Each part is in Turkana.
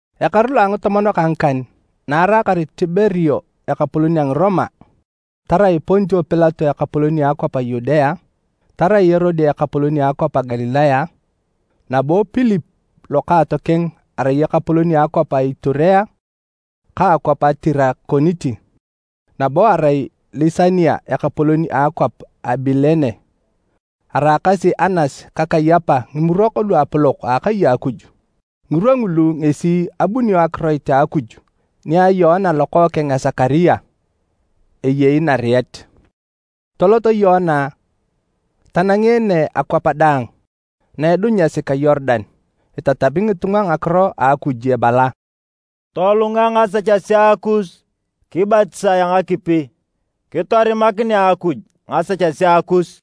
Ekaru lo a ngitomon ka ngikan na araakar Tiberio ekapolon a Ngiroma, tarai Pontio Pilato ekapolon a akwap a Yudea, tarai Erode ekapolon a akwap a Galilaya, nabo Pilip lokaatokeng arai ekapolon a akwap a Iturea ka akwap a Tirakoniti, nabo arai Lisania ekapolon a akwap a Abilene, araakasi Anas ka Kayapa Ngimurok Luapolok a akai a Akuj. Ngirwa ngulu ngesi abunio akiroit a Akuj nia Yoana lokookeng a Sekaria, eyei nariet. Tolot Yoana tanangeene akwap daang na edunyasi ka Yorudan, itatami ngitunga ngakiro a Akuj ebala, “Tolunga ngasechesea kus kibatisae a ngakipi, kitorimakinea Akuj ngasechesea kus.”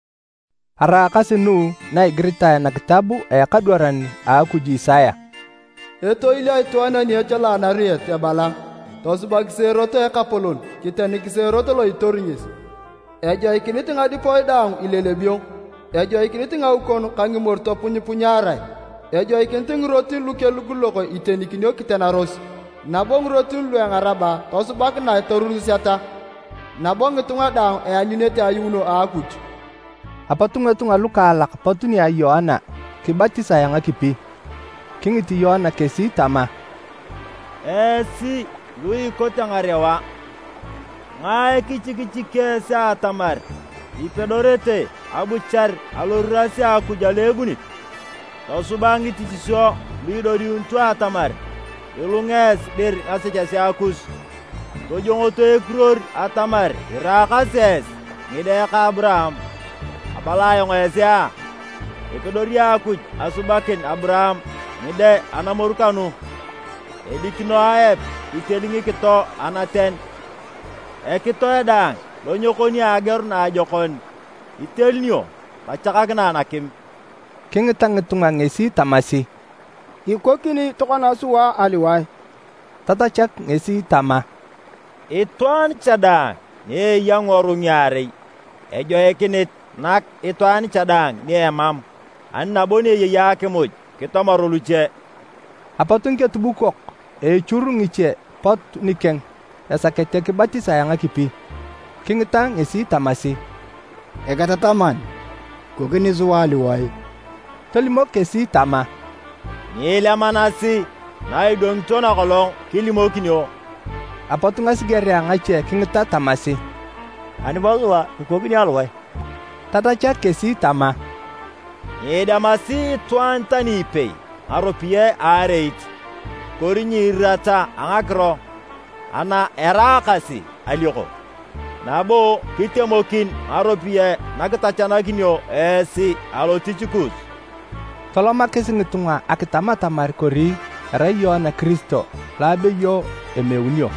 Araakasi nu na egiritae nakitab a ekadwaran Akuj Isaya: “Etoil a itwaan ani echala anariet ebala: ‘Tosubakisi erot a Ekapolon, kitenikisi erot lo itori ngesi! Ejoikinit ngadipoe daang ilelebio, ejoikinit ngaukon ka ngimoru topunyipunyarae, ejoikinit ngirotin lu kelugulugok itenikinio kitenaros, nabo ngirotin lu engarab tosubakinae toruruseta. Nabo ngitunga daang eanyunete ayuuno a Akuj!’” Apot ngitunga lukaalak pot nia Yoana kibatisae a ngakipi. Kingit Yoana kesi tama, “Esi lu ikote ngarewa, ngae kichikichiki esi atamar ipedorete abuchar aloriras a Akuj alo ebunit? Tosuba ngitichisio lu idodiunito atamar ilunga esi dir ngasechesea kus. Tojongoto ekiruor atamar iraakasi esi ngide ka a Aburaam. Abala ayong esi a! Epedori Akuj asubakin Aburaam ngide anamoru kanu! Edikino aep iteli ngikito anaten, ekitoe daang lo nyekoni ageor naajokon itelunio tachakakinae nakim.” Kingita ngitunga ngesi tamasi, “Kikokini tokona sua aliwae?” Tatachak ngesi tama, “Itwaan cha daang ni eya ngiworui ngiarei ejoikinit nak itwaan cha daang ni emam, ani nabo ni eyei akimuj kitomor luche.” Apot ngiketubukok echur ngiche pot nikeng esakete kibatisae a ngakipi. Kingita ngesi tamasi, “Eketataman, kikokini sua aliwae?” Tolimok kesi tama, “Nyiilemanasi na idwangito nakolong kilimokinio.” Apot ngasigerea ngache kingita tamasi, “Ani bo sua? Kikokini aliwae?” Tatachak kesi tama, “Nyiidemasi itwaan tani ipei ngaropiyae a areit, kori nyiirirata a ngakiro ana eraakasi alioko, nabo kitemokin ngaropiyae na kitachanakinio esi alotich kus.” Tolomakis ngitunga akitam atamar kori erai Yoana Kiristo lo abeyo emeunio.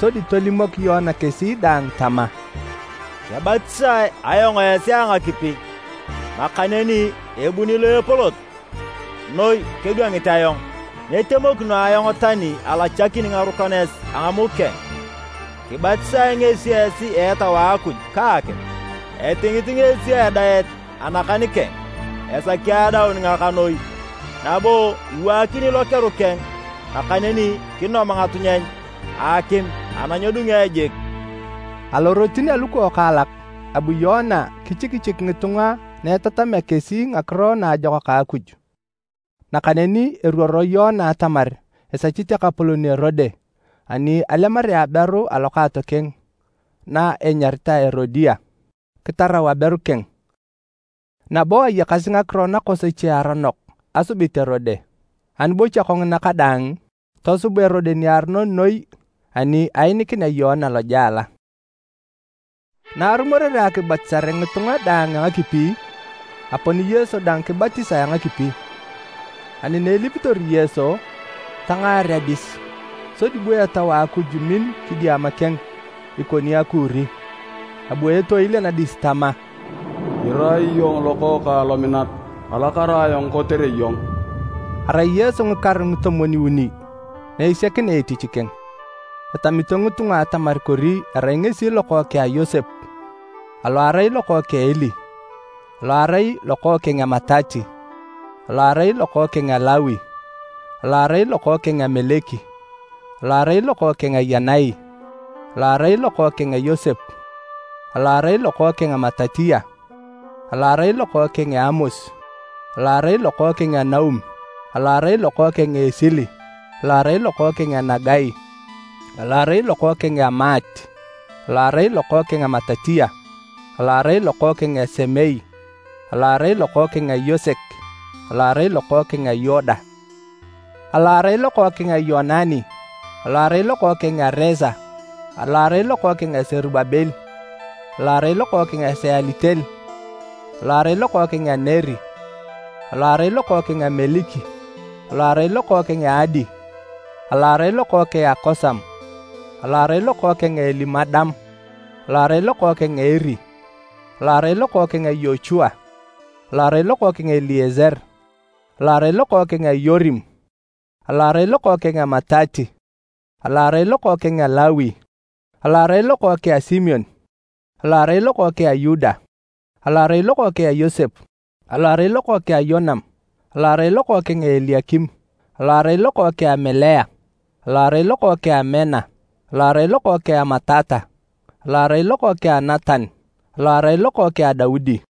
Sodi tolimok Yoana kesi daang tama, “Kebatisae ayong esi a ngakipi, nakaneni ebuni lo epolot noi kedwangit ayong, nyitemokino ayong tani alachakini ngarukanes a ngamuk keng. Kibatisae ngesi esi a Etau a Akuj ka akim. Etingit ngesi adaet anakan keng esaki adaun ngakanoi, nabo iwaakini lokeru keng, nakaneni kinom ngatunyeny a akim ana nyedunge jik.” Alorotin alukokaalak, abu Yoana kichikichik ngitunga na etatamea kesi Ngakiro Naajokak a Akuj. Nakaneni eruoro Yoana atamar esechit ekapolon Erode ani alemarea aberu a lokaatokeng na enyaritae Erodia, kitarau aberu keng, nabo ayakasi ngakiro nakosoche aronok asubit Erode. Ani bo kanguna kadaang, tosub Erode niaronon noi ani ainikinea Yoana lojela. Na arumorere akibatisare ngitunga daang a ngakipi, apon Yesu dang kibatisae a ngakipi. Ani na elipitor Yesu, tangaar adis, sodi bu Etau a Akuj min kidiama keng ikoni akuuri. Abu etoil anadis tama, “Irai iyong Lokookang lominat. Alakara ayong kotere iyong.” Arai Yesu ngikaru ngitomwon-uni na esiakinea etich keng. Etamito ngitunga atamar kori erai ngesi lokookeng a Yosep, alo arai lokookeng a Eli, alo arai lokookeng a Matati, alo arai lokookeng a Lawi, alo arai lokookeng a Meliki, alo arai lokookeng a Yanai, alo arai lokookeng a Yosep, alo arai lokookeng a Matatiya, alo arai lokookeng a Amos, alo arai lokookeng a Naum alo arai lokookeng a Esili, alo arai lokookeng a Nagai, alo arai lokookeng a Maat, alo arai lokookeng a Matatiya, alo arai lokookeng a Semei, alo arai lokookeng a Yosek, alo arai lokookeng a Yoda, alo arai lokookeng a Yoanani, alo arai lokookeng a Resa, alo arai lokookeng a Serubabel, alo arai lokookeng a Sealitel, alo arai lokookeng a Neri, alo arai lokookeng a Meliki, alo arai lokookeng a Adi, alo arai lokookeng a Kosam, alo arai lokookeng a Elimadam, alo arai lokookeng a Eri, alo arai lokookeng a Yochua, alo arai lokookeng a Elieser, alo arai lokookeng a Yorim, alo arai lokookeng a Matati, alo arai lokookeng a Lawi, alo arai lokookeng a Simeon, alo arai lokookeng a Yuda, alo arai lokookeng a Yosep, alo arai lokookeng a Yonam, alo arai lokookeng a Eliakim, alo arai lokookeng a Melea, alo arai lokookeng a Mena, alo arai lokookeng a Matata, alo arai lokookeng a Natan, alo arai lokookeng a Daudi,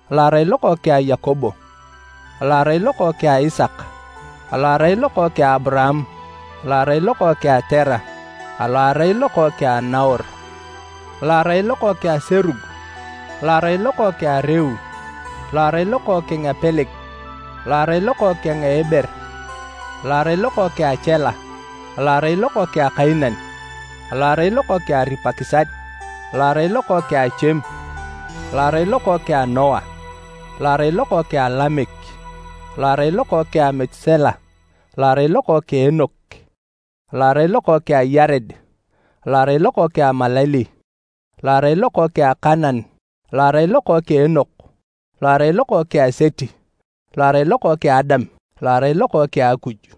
alo arai lokookeng a Yakobo, alo arai lokookeng a Isaka, alo arai lokookeng a Aburaam, alo arai lokookeng a Tera, alo arai lokookeng a Naor, alo arai lokookeng a Serug, alo arai lokookeng a Reu, alo arai lokookeng a Peleg, alo arai lokookeng a Eber, alo arai lokookeng a Chela, alo arai lokookeng a Kainan, alo arai lokookeng a Aripakisad, alo arai lokookeng a Chem, alo arai lokookeng a Noa, alo arai lokookeng a Lamek, alo arai lokookeng a Metusela, alo arai lokookeng a Enok, alo arai lokookeng a Yared, alo arai lokookeng a Malaleli, alo arai lokookeng a Kainan, alo arai lokookeng a Enoch, alo arai lokookeng a Seti, alo arai lokookeng a Adam, alo arai lokookeng a Akuj.